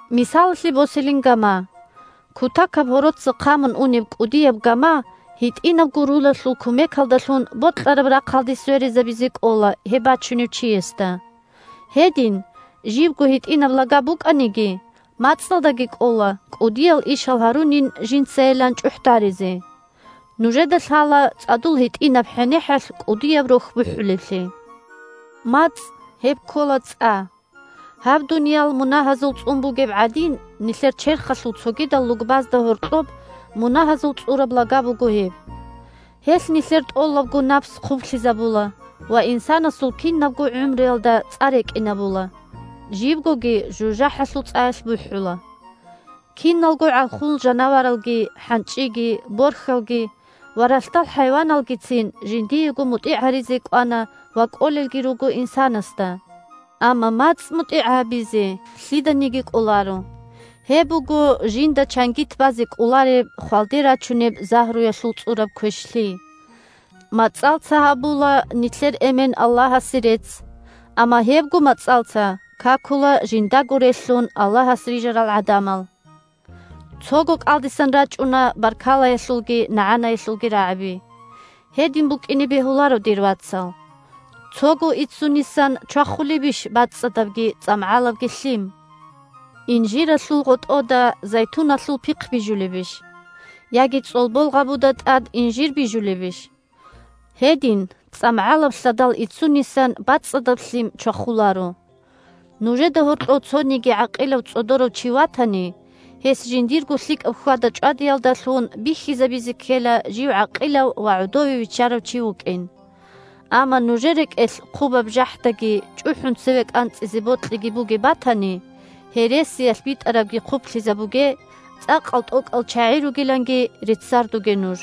Мисалалъе босилин гама: кутакаб гьороца хъамун унеб кӀудияб гама гьитӀинабго рулалъул кумекалдалъун бокьараб рахъалде сверизабизе кӀола гьеб бачунев чиясда. Гьедин, жибго гьитӀинаб лага букӀаниги, мацӀалдаги кӀола кӀудиял ишал гьарунин жинцайилан чӀухӀдаризе. Нужеда лъала цӀадул гьитӀинаб хӀенехӀалъ кӀудияб рохь бухӀулеблъи. МацӀ – гьеб ккола цӀа. Гьаб дуниял мунагьазул цӀун бугеб гӀадин, нилъер черхалъул цогидал лугбазда гьоркьоб мунагьазул цӀураб лага буго гьеб. Гьелъ нилъер тӀолабго напс хъублъизабула ва инсанасул кинабго гӀумруялда цӀа рекӀинабула, жибгоги жужахӀалъул цӀаялъ бухӀула. Киналго гӀалхул жанаваралги, хӀанчӀиги, борхьалги ва ралъдал хӀайваналгицин жиндего мутӀигӀ гьаризе кӀвана ва кӀолелги руго инсанасда, амма мацӀ мутӀигӀ гьабизе лъиданиги кӀоларо. Гьеб буго жинда чангит базе кӀолареб, хвалде рачунеб загьруялъул цӀураб квешлъи. МацӀалца гьабула нилъер Эмен Аллагьасе рецц, амма гьебго мацӀалца какула жиндаго релълъун Аллагьас рижарал гӀадамал. Цого кӀалдисан рачӀуна баркалаялъулги нагӀанаялъулги рагӀаби. Гьедин букӀине бегьуларо, дир вацал. Цого иццунисан чвахулебищ бацӀцӀадабги цӀамгӀалабги лъим? Инжиралъул гъотӀода зайтуналъул пихъ бижулебищ? Яги цӀолбол гъабуда тӀад инжир бижулебищ? Гьедин цӀамгӀалаб лъадал иццунисан бацӀцӀадаб лъим чвахуларо. Нужеда гьоркьов цониги гӀакъилав-цӀодорав чи ватани, гьес жиндирго лъикӀаб хьвада-чӀвадиялдалъун бихьизабизе ккела жив гӀакъилав ва гӀодове виччарав чи вукӀин. Амма нужер рекӀелъ хъубаб жахӀдаги чӀухӀун цеве кӀанцӀизе бокьиги бугеб батани, гьересиялъ битӀарабги хъублъизабуге, цӀакъал-тӀокӀал чагӀи ругиланги реццаруге нуж.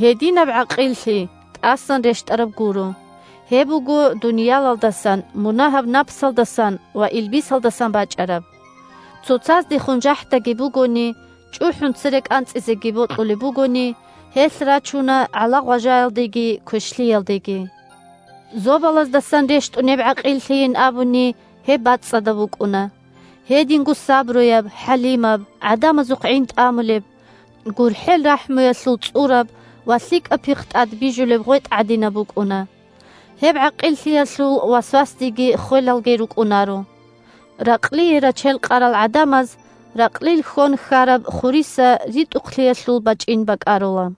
Гьединаб «гӀакъиллъи» тӀасан рещтӀараб гуро, гьеб буго дуниялалдасан, мунагьаб напсалдасан ва илбисалдасан бачӀараб. Цоцаздехун жахӀдаги бугони, чӀухӀун цере кӀанцӀизеги бокьулеб бугони, гьелъ рачуна гӀала-гъважаялдеги квешлъиялдеги. Зобалаздасан рещтӀунеб гӀакъиллъийин абуни, гьеб бацӀцӀадаб букӀуна, гьединго сабруяб, хӀалимаб, гӀадамазухъ гӀин тӀамулеб, гурхӀел-рахӀмуялъул цӀураб ва лъикӀаб пихъ тӀад бижулеб гъветӀ гӀадинаб букӀуна. Гьеб гӀакъиллъиялъул васвасдиги ххвелалги рукӀунаро. Ракълие рачел къарал гӀадамаз ракълил хьон хьараб хуриса ритӀухълъиялъул бачӀин бакӀарула.